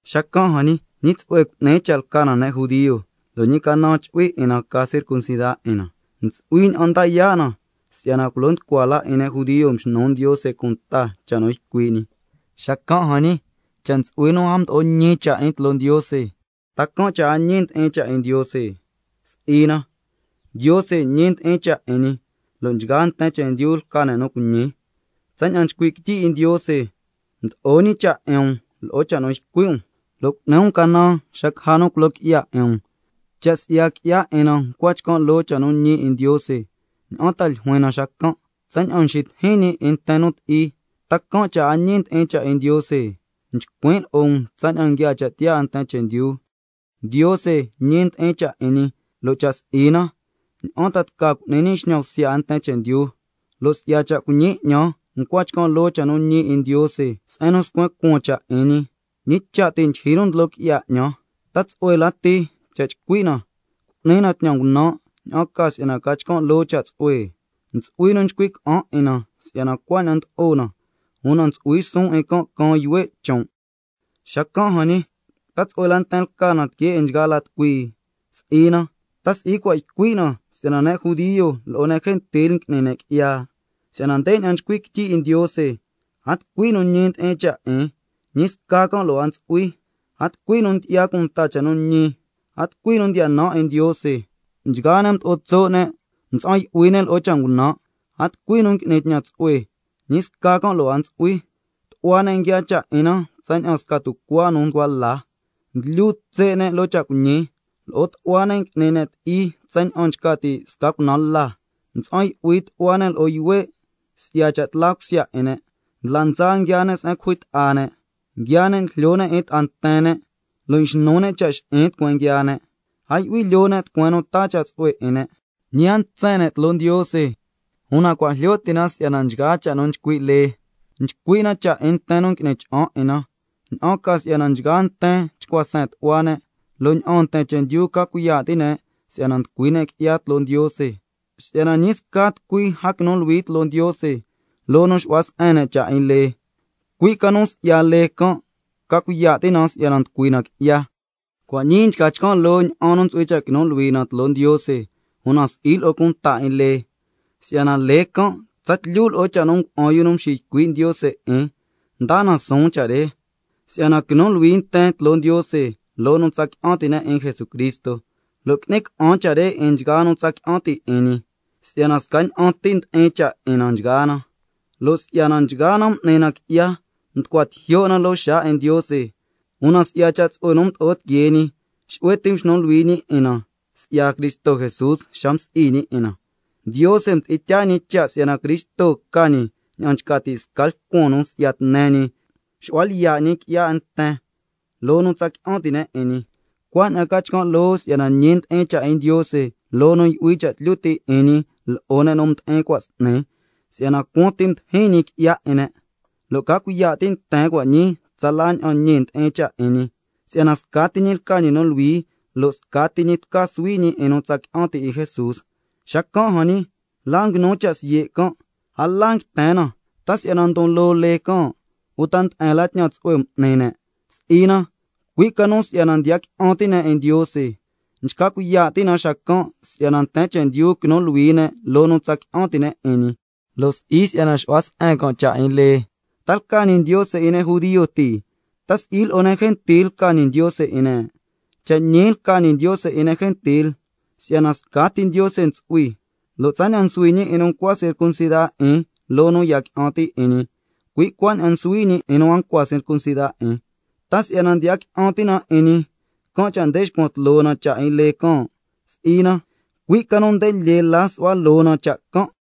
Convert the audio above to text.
Xacan' jan ñi, ¿ñi tsu'hue cu'ni cha' lca na ne' judio, lo' ñi canan chu'hui 'in na ca circuncida 'in na? Ntsu'hui ña'an nda yaa' na, si'yana culo nducua la 'in ne' judio mxnu Ndiose cunta cha' nu ycui' ñi. Xacan' jan ñi, cha' ntsu'hui nu a mdo'o ñi cha' 'in tloo Ndiose, ¿ta can' cha' a ñi ndi'in cha' 'in Ndiose? Si'i na, si'yana Ndiose ñi ndi'in cha' 'in ñi, lo' nchgaa nten chendyu lca ne' nu cuiñi, cui' ña'an nchcui' quityi 'in Ndiose: —Si'yana mdo'o ñi cha' 'in um lo'o cha' nu ycui' um, lo' cu'ni um canan xa caja nu culo qui'ya 'in um—. Cha' si'ya qui'ya 'in na nchca chcan' loo cha' nu ñi 'in Ndiose, ¿ña'an ta ljuin na xacan'? ¿Tsaña'an nxitijin ñi 'in nten nu ti'i, ta can' cha' a ñi ndi'in cha' 'in Ndiose? (Nchcuin' lo'o um tsaña'an nguiaa cha' tiyaa 'in nten chendyu.) Ndiose ñi ndi'in cha' 'in ñi, lo' cha' si'i na, ¿ña'an ta tca cu'ni ñi xñan bsya 'in nten chendyu cha' na can'? Lo' si'ya cha' cuiñi 'ñan, ncua chcan' loo cha' nu ñi 'in Ndiose se'en nu scuen cuaan cha' 'in ñi, ¿ñi cha' ti' ndyijyi nu ndlo qui'ya 'ñan cha' na can'? ¿Ta tsu'hue lati cha' chcui' na: Cu'ni na tñan ngunan', ña'an ca si'yana ca chcan' loo cha' tsu'hue? (Ntsu'hui nu nchcui' ca'an 'in na si'yana cuaña'an ndlo'o na, una ntsu'hui suun 'in can' caan yuhue' chon'). Xacan' jan ñi, ¿ta tsu'hue la nten lca na que 'in nchgaa la tucui? Si'i na, ¿ta si'i cua' ycui' na si'yana ne' judio lo'o ne' gentil ngui'ni ne' qui'ya? Si'yana ndeña'an nchcui' quityi 'in Ndiose: —A tucui nu ñi ndi'in cha' 'in, ñi sca can' lo' a ntsu'hui, a tucui nu ndyi'ya cunta cha' nu ñi, a tucui nu ndiya nan 'in Ndiose. Nchgaa ne' mdo'o tso' ne', mtsa'an yu'hui ne' lo'o cha' ngunan', a tucui nu ngui'ni tñan tsu'hue, ñi sca can' lo' a ntsu'hui. Tu'hua ne' nguiaa cha' 'in na tsaña'an sca tucuaa nu nducua la, nguilyu tse' ne' loo cha' cuiñi, lo'o tu'hua ne' n'ni ne' ti'i tsaña'an nchca ti' sca cunaan la. Mtsa'an yu'hui tu'hua ne' lo'o yuhue' si'ya cha' tla cusya 'in ne'. Ndla ndsa nguiaa ne' se'en nu cujui ta'a ne'. Nguiaa ne' njlyo ne' 'in ta'a nten ne', lo' nxnu ne' cha' xi'in tucueen nguiaa ne'. A yu'hui lyoo ne' tucueen nu taa cha' tsu'hue 'in ne', ñi a ntsen ne' tloo Ndiose—. Una cua' jlyo ti' na si'yana nchgaa cha' nu nchcui' lee, nchcui' na cha' 'in nten nu ngui'ni cha'an 'in na, ña'an ca si'yana nchgaa nten chcua seen tu'hua ne', lo' ña'aan nten chendyu ca cuiya' ti' ne' si'yana nducui ne' qui'ya tloo Ndiose. —Si'yana ñi sca tucui a quinu luhui tloo Ndiose— loo nu xu'hua se'en cha' 'in lee, cui' ca nu si'ya lee can' ca cuiya' ti' na si'yana nducui na qui'ya. Cua' ñii nchca chcan' loo ña'an nu ntsu'hui cha' quinu luhui na tloo Ndiose, una si'i lo'o cunta 'in lee, si'yana lee can' tsatlyu lo'o cha' nu ngua'an yu nu mxiycui' Ndiose 'in ndaa na suun cha' re, si'yana quinu luhui nten tloo Ndiose loo nu tsa qui'an ti' ne' 'in Jesucristo, lo' qui'ni ca'an cha' re 'in nchgaa nu tsa qui'an ti' 'in ñi, si'yana scaña'an ti ndi'in cha' 'in na nchgaa na, si'yana nchgaa na m'ni na qui'ya, mducua tijyo' na loo xaa 'in Ndiose. Una si'ya cha' tsu'hue nu mdo'o tiquee ñi, xu'hue ti mxnu luhui ñi 'in na si'ya Cristo Jesús xa msi'i ñi 'in na, Ndiose mdi'in tyaa ñi cha' si'yana Cristo ca ñi ña'an nchca ti' sca lcuan nu si'ya tne ñi xu'hua lyiya' qui'ya 'in nten loo nu tsa qui'an ti' ne' 'in ñi, cuaña'an ca chcan' loo si'yana ñi ndi'in cha' 'in Ndiose loo nu yu'hui cha' tlyu ti' 'in ñi lo'o ne' nu mdi'in cua' s'ni tsaña'an cuaan ti mdijin ñi qui'ya 'in ne', lo' ca cuiya' ti' nten cua' ñii, tsala ña'an ñi ndi'in cha' 'in ñi, cui' si'yana scati ñi lca ñi nu luhui, lo' scati ñi tca suhui ñi 'in nu tsa qui'an ti' 'in Jesús. Xacan' jan ñi, ¿la nguinu cha' siye' can'? A la nguiten na. ¿Ta si'yana ndon loo lee can', uta nde'en la tñan tsu'hue m'ni ne'? Si'i na, cui' ca nu si'yana ndiya qui'an ti' ne' 'in Ndiose. Nchca cuiya' ti' na xacan' si'yana nten chendyu quinu luhui ne' loo nu tsa qui'an ti' ne' 'in ñi, lo' si'i si'yana xu'hua se'en can' cha' 'in lee. ¿Ta lca ñi Ndiose 'in ne' judio ti? ¿Ta si'i lo'o ne' gentil lca ñi Ndiose 'in ne'? Cha' ñi lca ñi Ndiose 'in ne' gentil. Si'yana —scati Ndiose ntsu'hui—, lo' tsaña'an nsuhui ñi 'in nu ncua circuncida 'in loo nu ndiya qui'an ti' 'in ñi, cui' cuaña'an nsuhui ñi 'in nu a ncua circuncida 'in. ¿Ta si'yana ndiya qui'an ti' na 'in ñi, can' cha' nde nxcuan tloo na cha' 'in lee can'? Si'i na, cui' ca nu nde lyee la nsu'hua loo na cha' can'.